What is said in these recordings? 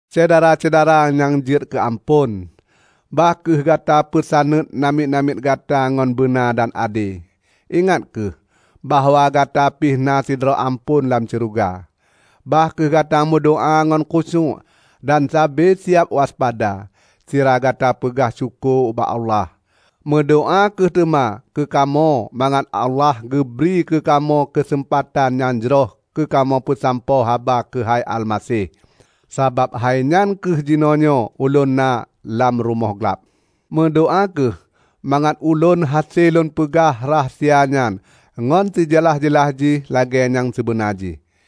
Syedara-syedara nyang jeuet keu amphon! Bah kheueh gata peusaneut namiet-namiet gata ngon beuna dan ade. Ingat kheueh bahwa gata pih na sidroe amphon lam syeuruga. Bah kheueh gata meudoá ngon khusyuék dan sabe siab waspada, sira gata peugah syukoe ubak Allah. Meudoá kheueh teuma keukamoe mangat Allah geubri keukamoe keuseumpatan nyang jroh keukamoe peusampoe haba keuhai Almaseh. Sabab hainyan kheueh jinoenyoe ulôn na lam rumoh glab. Meudoá kheueh mangat ulôn hase lôn peugah rahsia nyan ngon sijeulaih-jeulaih jih lagée nyang sibeuna jih.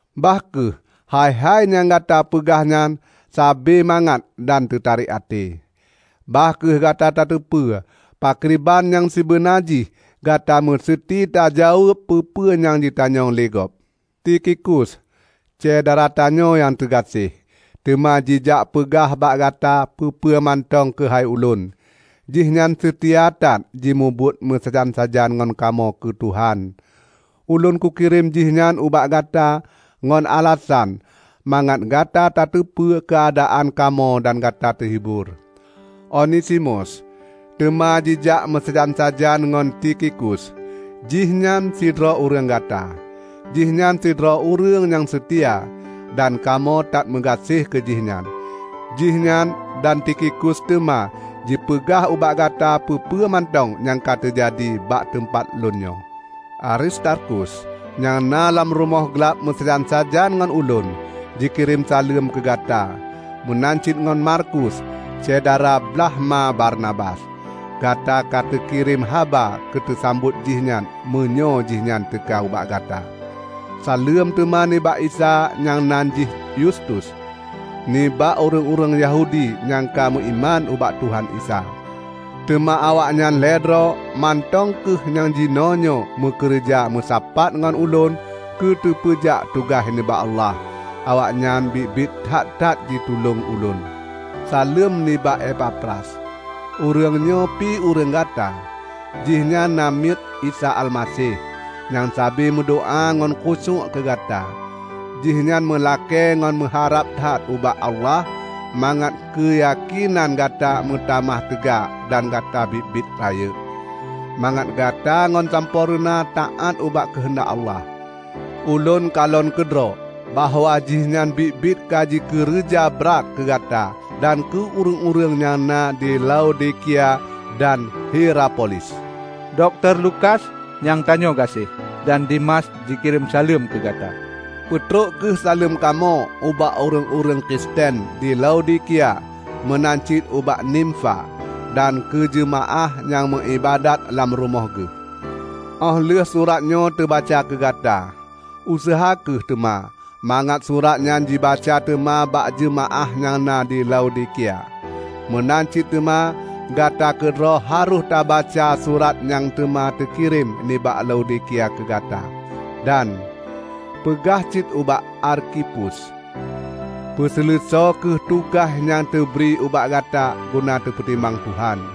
Bah kheueh hai-hai nyang gata peugah nyan sabe mangat dan teutarek até. Bah kheueh gata tateupeue pakriban nyang sibeuna jih gata meuseuti tajaweueb peue-peue nyang jitanyong lé gob. Tikhikus, syedara tanyoe nyang teugaséh, teuma jijak peugah bak gata peue-peue mantong keuhai ulôn. Jihnyan seutia that jimubuet meusajan-sajan ngon kamoe keu Tuhan. Ulôn kukirém jihnyan ubak gata ngon alasan mangat gata tateupeue keuadaan kamoe dan gata teuhibor. Onesimus teuma jijak meusajan-sajan ngon Tikhikus; jihnyan sidroe ureuëng gata. Jihnyan sidroe ureuëng nyang seutia, dan kamoe that meugaséh keu jih nyan. Jihnyan dan Tikhikus teuma jipeugah ubak gata peue-peue mantong nyang ka teujadi bak teumpat lôn nyoe. Aristarkus, nyang na lam rumoh glab meusajan-sajan ngon ulôn, jikirém saleuem keu gata. Meunan cit ngon Markus, syedara blaih ma Barnabas. (Gata ka teukirém haba keuteusambot jihnyan meunyoe jihnyan teuka ubak gata.) Saleuem teuma nibak Isa nyang nan jih Yustus. Nibak ureuëng-ureuëng Yahudi nyang ka meuiman ubak Tuhan Isa, teuma awaknyan lhée droe mantong kheueh nyang jinoenyoe meukeureuja meusapat ngon ulôn keuteupeujak tugaih nibak Allah. Awaknyan biet-biet that-that jitulông ulôn. Saleuem nibak Epafras. Ureuëng nyoe pi ureuëng gata. Jihnyan namiet Isa Almaseh, nyang sabe meudoá ngon khusyuék keu gata. Jihnyan meulakée ngon meuharab that ubak Allah mangat keuyakénan gata meutamah teuga dan gata biet-biet rayeuk, mangat gata ngon sampoereuna taát ubak keuheundak Allah. Ulôn kalon keudroe bahwa jihnyan biet-biet ka jikeureuja brat keu gata dan keu ureuëng-ureuëng nyang na di Laodikia dan Hierapolis. Dokto Lukas, nyang tanyoe gaséh, dan Demas jikirém saleuem keugata. Peutrok kheueh saleuem kamoe ubak ureuëng-ureuëng Kristen di Laodikia; meunan cit ubak Nimfa, dan keu jeumaáh nyang meuiébadat lam rumoh geuh. Óh lheueh surat nyoe teubaca keugata, useuha kheueh teuma mangat surat nyan jibaca teuma bak jeumaáh nyang na di Laodikia. Meunan cit teuma gata keudroe harôh tabaca surat nyang teuma teukirém nibak Laodikia keugata. Dan peugah cit ubak Arkhipus, "Peuseuleusoe kheueh tugaih nyang teubri ubak gata guna teupeutimang Tuhan."